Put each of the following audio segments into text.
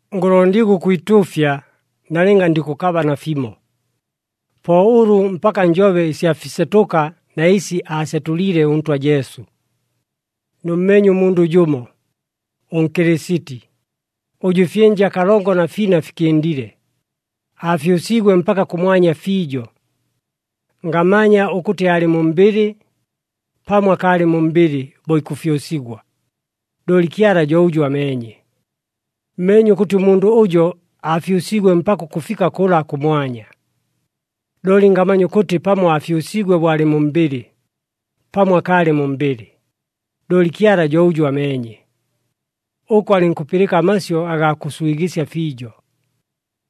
Ngʉlondigwa ʉkwituufya, nalɨnga ndikʉkaba nafimo. Po ʉlʉ mpaka njobe ɨsya fisetʉka na ɨsi aasetʉliile ʉNtwa Jesu. Nʉmmeenye ʉmundʉ jʉmo, ʉNkɨlɨsiti, ʉjʉ ɨfyɨnja kalongo na fina fikɨndile, aafyʉsiigwe mpaka kʉmwanya fiijo. Ngamanya ʉkʉtɨ aalɨ mu mbɨlɨ, pamo akaalɨ mu mbɨlɨ bo ikʉfyʉsigwa, looli Kyala jo ʉjʉ ameenye. Mmeenye ʉkʉtɨ ʉmundʉ ʉjo aafyʉsiigwe mpaka ʉkʉfika kʉla kʉmwanya, looli ngamanya ʉkʉtɨ pamo aafyʉsiigwe bo aalɨ mu mbɨlɨ, pamo akaalɨ mu mbɨlɨ, looli Kyala jo ʉjʉ ameenye. Ʉko alɨnkʉpɨlɨka amasyʉ agaa kʉswigɨsya fiijo,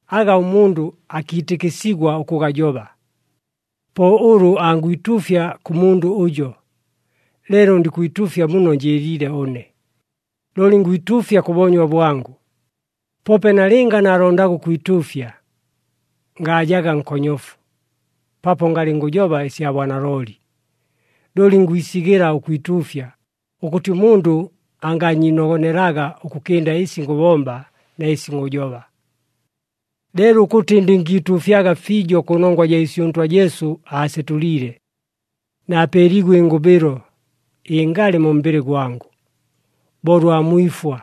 aga ʉmundʉ akiitɨkɨsigwa ʉkʉgajoba. Po ʉlʉ angwituufya kʉ mundʉ ʉjo, leelo ndikwituufya muno njɨɨliile ʉne, looli ngwituufya kʉ boonywa bwangʉ. Poope nalɨnga naalondaga ʉkwituufya, ngaajaga nkonyofu, paapo ngalɨ ngʉjoba ɨsya bwanalooli. Looli ngwisigɨla ʉkwituufya, ʉkʉtɨ ʉmundʉ angaanyiinogonelaga ʉkʉkɨnda ɨsi ngʉbomba na ɨsi ngʉjoba. Leelo ʉkʉtɨ ndɨngiituufyaga fiijo kʉnongwa jaa ɨsi ʉNtwa Jesu aasetʉliile, naapeeliigwe ɨngʉbɨlo ɨngalɨ mu mbɨlɨ gwangʉ, bo ʉlwa mwifwa.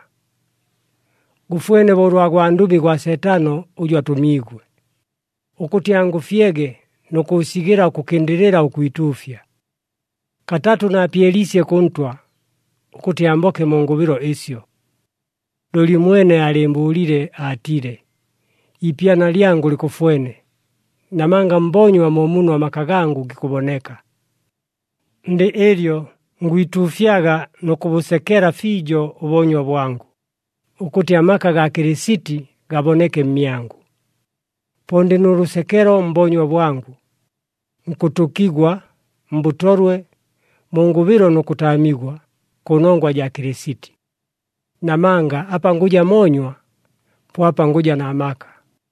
Gʉfwene bo ʉlwa gwandʉmi gwa Seetano ʉjʉ atʉmiigwe, ʉkʉtɨ angʉfyege nʉ kʉʉsigɨla ʉkʉkɨndɨlɨla ʉkwituufya. Katatʉ naapyeliisye kʉ Ntwa, ʉkʉtɨ amboke mu ngʉbɨlo ɨsyo. Looli ʉmwene aalɨɨmbʉʉlile aatile, “Iipyana lyangʉ likʉfwene, namanga mboonywa mo muno amaka gangʉ gikʉboneka.” Ndɨ ɨlyo, ngwituufyaga nʉ kʉbʉsekela fiijo ʉboonywa bwangʉ, ʉkʉtɨ amaka gaa Kɨlɨsiti gaboneke mmyangʉ. Po ndɨ nʉ lʉsekelo mboonywa bwangʉ, nkʉtʉkigwa, mbʉtolwe, mu ngʉbɨlo nʉ kʉtaamigwa, kʉnongwa jaa Kɨlɨsiti. Namanga apa ngʉja moonywa, po apa ngʉja na maka.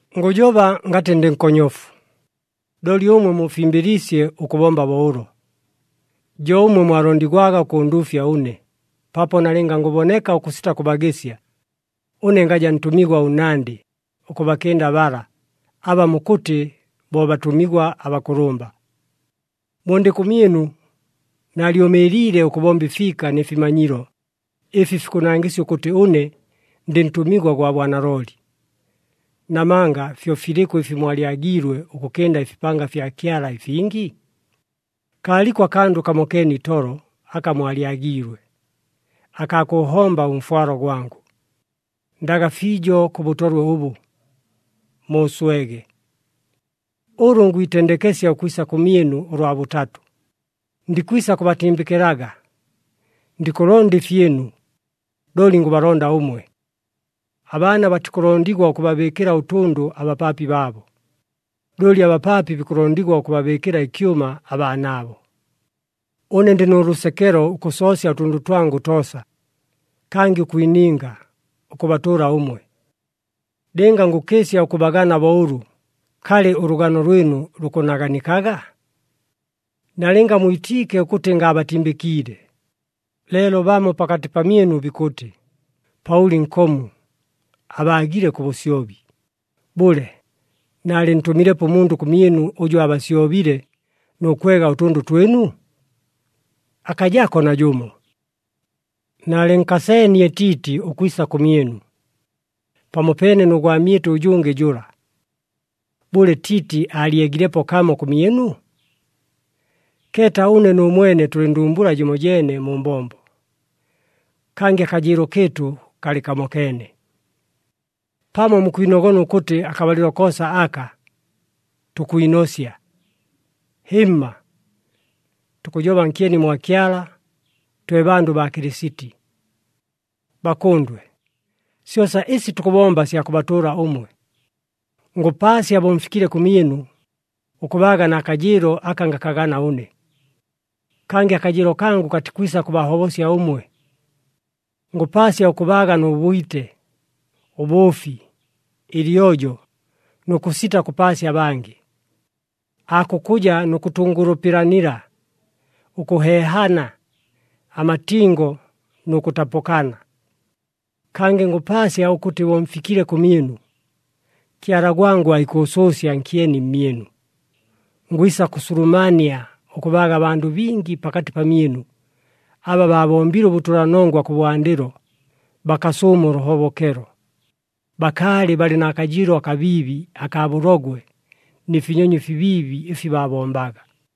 Ngʉjoba ngatɨ ndɨ nkonyofu, looli ʉmwe muufimbɨliisye ʉkʉbomba bo ʉlo. Jo ʉmwe mwalondigwaga ʉkʉnduufya ʉne, paapo nalɨnga ngʉboneka ʉkʉsita kʉbagɨsya, ʉne ngaja ntʉmigwa ʉnnandɨ ʉkʉbakɨnda bala, aba mukʉtɨ bo, “Batʉmigwa abakʉlʉmba.” Bo ndɨ kʉmyɨnu, naalyʉmɨɨliile ʉkʉbomba ɨfiika nɨ fimanyilo ɨfi fikʉnangɨsya ʉkʉtɨ ʉne ndɨ ntʉmigwa gwa bwanalooli. Namanga fyo filɨkʉ ɨfi mwalyagiilwe ʉkʉkɨnda ɨfipanga fya Kyala ɨfingi? Kaaliko akandʉ kamokeene itolo aka mwalyagiilwe, akaa kʉʉhomba ʉmfwalo gwangʉ! Ndaga fiijo kʉ bʉtolwe ʉbʉ! Muuswege! Ʉlʉ ngwitendekesya ʉkwisa kʉmyɨnu ʉlwa bʉtatʉ, ndikwisa kʉbatimbɨkɨlaga. Ndikʉlonda ɨfyɨnu, looli ngʉbalonda ʉmwe. Abaana batikʉlondigwa ʉkʉbabɨɨkɨla ʉtʉndʉ abapaapi baabo, looli abapaapi bikʉlondigwa ʉkʉbabɨɨkɨla ɨkyʉma abaanaabo. Ʉne ndɨ nʉ lʉsekelo ʉkʉsoosya ʉtʉndʉ twangʉ toosa, kangɨ ʉkwininga, ʉkʉbatʉʉla ʉmwe. Lɨnga ngʉkɨɨsya ʉkʉbagana bo ʉlʉ, kalɨ, ʉlʉgano lwɨnu lukʉnaganikaga? Nalɨnga mwitiike ʉkʉtɨ ngaabatimbɨkiile, leelo bamo pakatɨ pamyɨnu bikʉtɨ, “Paʉli nkomu, abaagile kʉ bʉsyobi.” Bʉle, naalɨntʉmilepo ʉmundʉ kʉmyɨnu ʉjʉ aabasyobile nʉ kwega ʉtʉndʉ twɨnu? Akajako najʉmo! Naalɨnkaseenie Tiiti ʉkwisa kʉmyɨnu, pamopeene nʉ gwamyɨtʉ ʉjʉngɨ jʉla. Bʉle, Tiiti aalyegilepo kamo kʉmyɨnu? Keeta ʉne nʉ mwene tʉlɨ ndumbula jɨmojeene mu mbombo, kangɨ akajɨɨlo kɨɨtʉ kalɨ kamokeene! Pamo mukwinogona ʉkʉtɨ akabalɨlo koosa aka, tukwinosya. Hɨmma! Tukʉjoba nkyeni mwa Kyala, twe bandʉ baa Kɨlɨsiti. Bakʉndwe, syosa ɨsi tukʉbomba sya kʉbatʉʉla ʉmwe. Ngʉpaasya bo mfikile kʉmyɨnu, ʉkʉbaaga na kajɨɨlo aka ngakagana ʉne. Kangɨ akajɨɨlo kangʉ katikwisa kʉbahobosya ʉmwe. Ngʉpaasya ʉkʉbaaga nʉ bwite, ʉbʉʉfi, ɨlyojo nʉ kʉsita kʉpaasya abangɨ. Aakukʉja nʉ kʉtʉngʉlʉpɨlanila, ʉkʉheehana, amatingo nʉ kʉtapʉkana. Kangɨ ngʉpaasya ʉkʉtɨ bo mfikile kʉmyɨnu, Kyala gwangʉ aikʉʉsʉʉsya nkyeni mmyɨnu. Ngwisa kʉsulumania ʉkʉbaaga abandʉ bingi pakatɨ pamyɨnu aba baabombile ʉbʉtʉlanongwa kʉbwandɨlo, bakasʉʉma ʉlʉhobokelo. Bakaalɨ balɨ na kajɨɨlo akabiibi akaa bʉlogwe nɨ finyonyo ɨfibiibi ɨfi baabombaga.